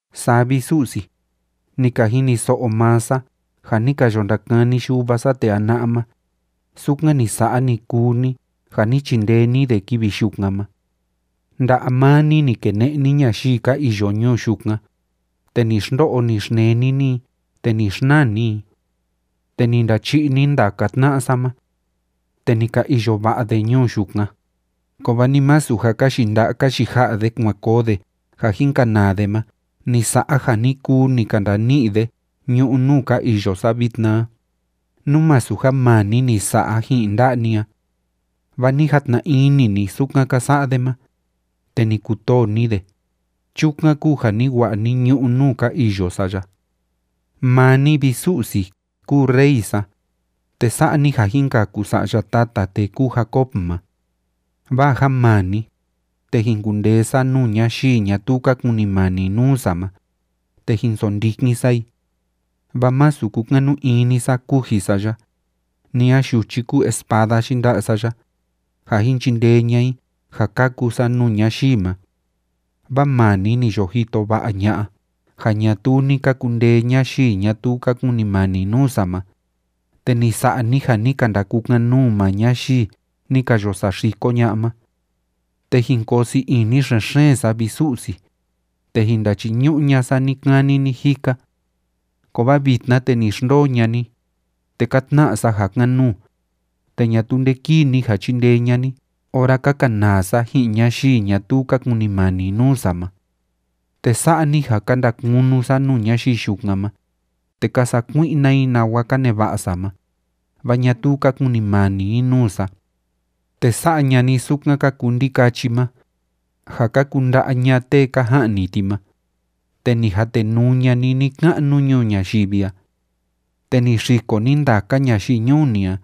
Saa vi, Su'si, ni ka jiniso'o maa sa ja ni ka yo ndakani yuva sa tee jana'a ma, sukan ni sa'a, ni kuu ni, ja ni chindee ni de kivi yukan ma. Nda'a maa ni, ni kene'e ni ñayii ka iyo ñuu yukan, te ni xndo'o, ni xneni ni i, te ni xnaa ni i. Te ni ndachi'i ni ndaka tna'a sa ma, te ni ka iyo va'a de ñuu yukan. Kovaa ni masu ja ka yinda'a ka yija'a de kuan koo de ja jin kanaa de ma ni sa'a ja ni kuu ni ka ndani'i de ñu'ú nuu ka iyo sa vitna a, nú masu ja maa ni ni sa'a ji'in nda'a ni a. Vaa ni jatna ini ni sukan ka sa'a de ma, te ni kutoo ni de, chukan kúu ja ni wa'a ni ñu'ú nuu ka iyo sa ya. Maa ni, vi Su'si, kúu Rey sa, te sa'a ni ja jin kaku sa'ya tata tee kúu Jacob ma. Vaa ja maa ni, te jin kundee sa nuu ñayii ñatuu ka kunimani nuu sa ma, te jin sondikin sa i. Vaa masu kúkanu ini sa kuji sa ya, ni a yuchi kúu espada yinda'a sa ya, ja jin chindee ña'a i ja kaku sa nuu ñayii ma. Vaa maa ni ni yo jito va'a ña'a ja ñatuu ni ka kundee ñayii ñatuu ka kunimani nuu sa ma, te ni sa'a ni ja ni ka ndakukan‑nuu maa ñayii ni ka yo saxiko ña'a ma. Te jin koo sii ini xen‑xeen sa, vi Su'si, te jin ndachiñu'u ña'a sa ni‑kani ni‑jika. Kovaa vitna, te ni xndoo ña'a ni, te ka tna'a sa ja kan‑nuu, te ñatuu nde kíi ni ja chíndee ña'a ni ora ka kanaa sa ji'in ñayii ñatuu ka kunimani nuu sa ma. Te sa'a ni ja ka ndakunu sa nuu ñayii yukan ma, te ka sakui'na i nawa ka neva'a sa ma, vaa ñatuu ka kunimani i nuu sa. Te sa'a ña'a ni sukan ka kuu ndikachi ma, ja ka kunda'a ña'a tee ka ja'ni ti ma, te ni jatenuu ña'a ni ni‑ka'nu ñuu ñayivi a. Te ni xiko ni ndaka ñayii ñuu ni a,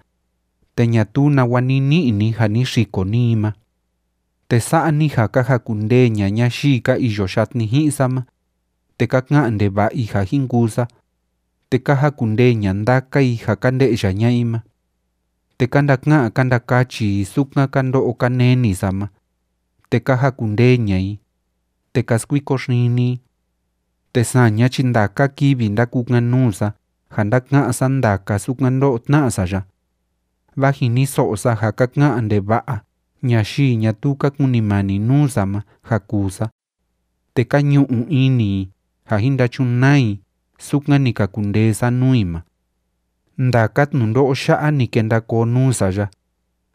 te ñatuu nawa ni ni'i ni ja ni xiko ni i ma. Te sa'a ni ja ka jakundee ña'a ñayii ka iyo yatni ji'in sa ma, te ka ka'an ndeva'a i ja jin kuu sa, te ka jakundee ña'a ndaka i ja ka nde'ya ña'a i ma. Te ka ndaka'an ka ndakachi i sukan ka ndo'o ka neni sa ma, te ka jakundee ña'a i, te ka skuiko xini i. Te saña chi ndaka kivi ndákukan‑nuu sa ja ndáka'án sa ndaka sukan ndó'o tná'a sa ya. Vaa jiniso'o sa ja ka ka'an ndeva'a ñayii ñatuu ka kunimani nuu sa ma ja kuu sa, te ka ñu'u ini i ja jin ndachunaa i sukan ni ka kundee sa nuu i ma. Ndaka tnundo'o ya'a ni kenda koo nuu sa ya,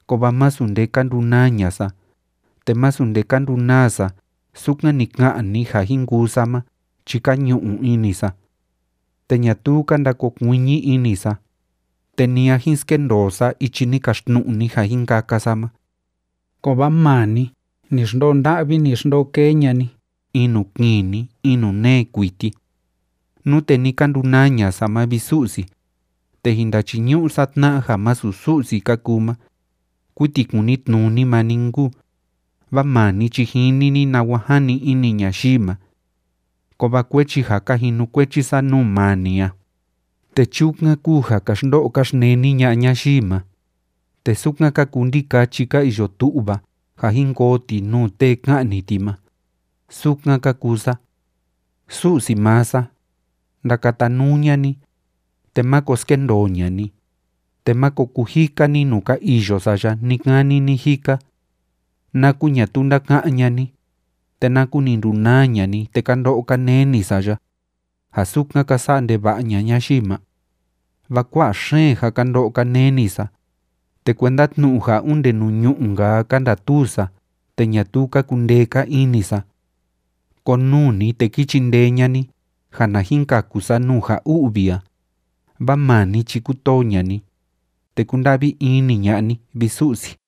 kovaa masu nde ka ndunaa ña'a sa, te masu nde ka ndunaa sa sukan ni ka'an ni ja jin kuu sa ma chi ka ñu'u ini sa. Te ñatuu ka ndakokuiñi ini sa, te ni a jin skendoo sa ichi ni kaxtnu'u ni ja jin kaka sa ma. Kovaa maa ni, ni xndoo nda'vi ni xndoo kee ña'a ni in nuu kini in nuu nee kuiti. Nute ni ka ndunaa ña'a sa ma, vi Su'si, te jin ndachiñu'u sa tna'a ja masu Su'si ka kuu ma, kuiti kunitnuni maa ni nkuu, vaa maa ni chi jini ni nawa jani ini ñayii ma. Kovaa kuechi ja ka jinukuechi sa nuu maa ni a, te chukan kúu ja ka xndo'o ka xneni ña'a ñayii ma, te sukan ka kuu ndikachi ka iyo tu'va ja jin koo ti nuu tee ka'ni ti ma, sukan ka kuu sa. Su'si maa sa, ndakatanuu ña'a ni, te máko skendoo ña'a ni, te máko kujika ni nuu ka iyo sa ya ni‑kani ni‑jika. ¿Naku ñatuu ndáka'án ña'a ni, te naku ni ndunaa ña'a ni te ka ndo'o ka neni sa ya, ja sukan ka sa'a ndeva'a ña'a ñayii ma? Vaa kua'a xeen ja ka ndo'o ka neni sa, te kuenda tnu'u ja onde nuu ñu'ú‑nka a ka ndatuu sa te ñatuu ka kundee‑ka ini sa. Konuu ni, te ki chindee ña'a ni ja na jin kaku sa nuu ja u'vi a, vaa maa ni chi kútoo ña'a ni, te kúnda'vi ini ña'a ni, vi Su'si.